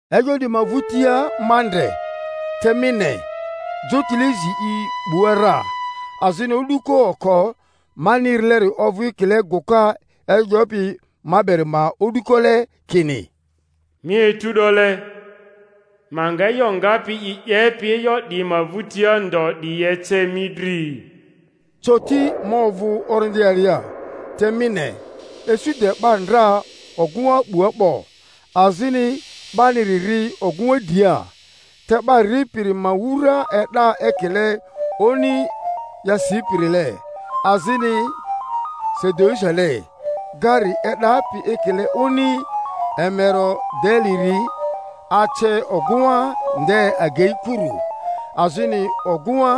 E'yo 'diyi ma vᴜtia ma ndre, te mi ne, jotile zi i 'bua ra! Azini o'duko oko mani erileri ovᴜ ekile gᴜka e'yo 'yopi ma beri ma o'dukole, kini, Mi etu 'dole, ma nga e'yo ngapi yi 'yepi e'yo 'diyi ma vᴜtia ndo 'diyi ece mi dri. Coti ma ovᴜ Orindi alia, te mi ne, isu de 'ba ndra ogᴜŋa 'bua 'bo, azini 'baniri ri ogᴜŋa dria! Te 'ba ripiri ma wura e'da ekile oni yasiperile, azini sadiusile; gari e'dapi ekile oni emerodeleri ace ogᴜŋa nde agei kuru. Azini ogᴜŋa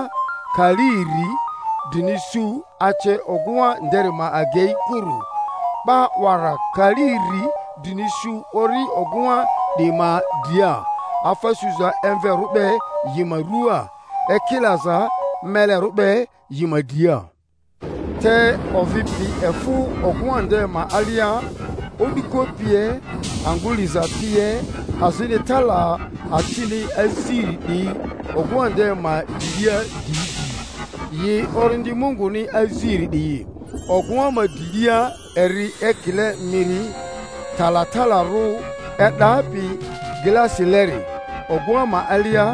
kali iri drini su ace ogᴜŋa nderi ma agei kuru; 'ba 'wara kali iri drini su ori ogᴜŋa 'diyi ma dria, afa suza emverᴜ be yi ma ruaa, ekilaza melerᴜ be yi ma dria. Te ovi pi efᴜ ogᴜŋa nde ma alia, o'duko pie, angᴜ liza pie. Azini tala acini aziri di ogᴜŋa nde ma drilia di di, yi Orindi Munguni aziri 'diyi; ogᴜŋa ma drilia eri ekile miri talatalarᴜ e'dapi glasileri. Ogᴜŋa ma alia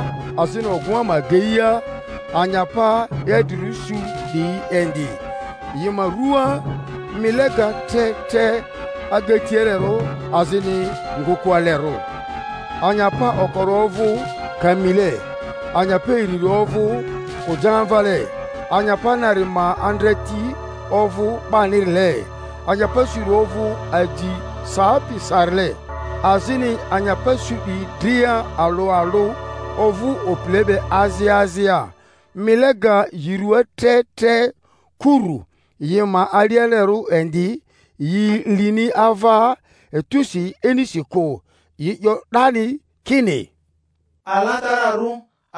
azini ogᴜŋa ma ageia, anyapa idrirᴜ su 'diyi indi, yi ma rᴜaa mile ga tre tre agatialerᴜ azini ngᴜkᴜalerᴜ: anyapa okori ovᴜ kamile, anyapa iriri ovᴜ kojamvale, anyapa nari ma andreti ovᴜ 'banirile, anyapa suri ovᴜ aji sapi sarile. Azini anyapa su 'diyi dria alᴜ alᴜ ovᴜ opile be azia azia, mile ga yi ruaa tre tre kurᴜ, yi ma alialerᴜ indi; yi lini ava etusi inisi kᴜ, yi 'yo 'dani kini, Alatararᴜ,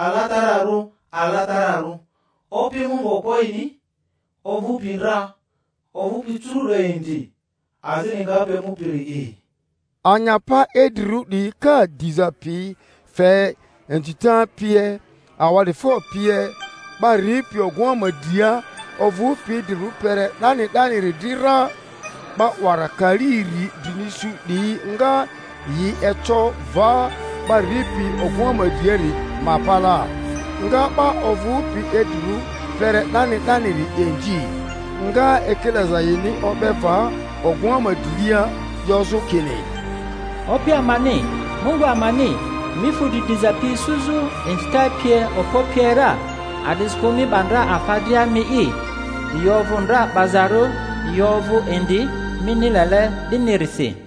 alatararᴜ, alatararᴜ, Opi Mungu Okpoe'ini, ovᴜpi ndra, ovᴜpi curu'do indi, azini ngapi emupiri'i! Anyapa idrirᴜ 'diyi ka diza pi fe inzita pie, awa'difo pie, 'ba ripi ogᴜŋa ma dria, ovᴜpi idrirᴜ kpere 'dani 'daniri dri ra, 'ba 'wara kali iri drini su 'diyi nga yi eco va 'ba ripi ogᴜŋa ma driari ma palaa, nga 'ba ovᴜpi idrirᴜ kpere 'dani 'daniri inzi, nga ekilaza yini o'be va ogᴜŋa ma drilia, 'yozᴜ kini, Opi amani, Mungu amani, mi fu dri diza pi isuzᴜ, inzita pie, okpo pie ra; a'disikᴜ mi 'ba ndra afa dria mi'i, yi ovᴜ ndra 'bazarᴜ, yi ovᴜ indi, mini lele 'dinirisi.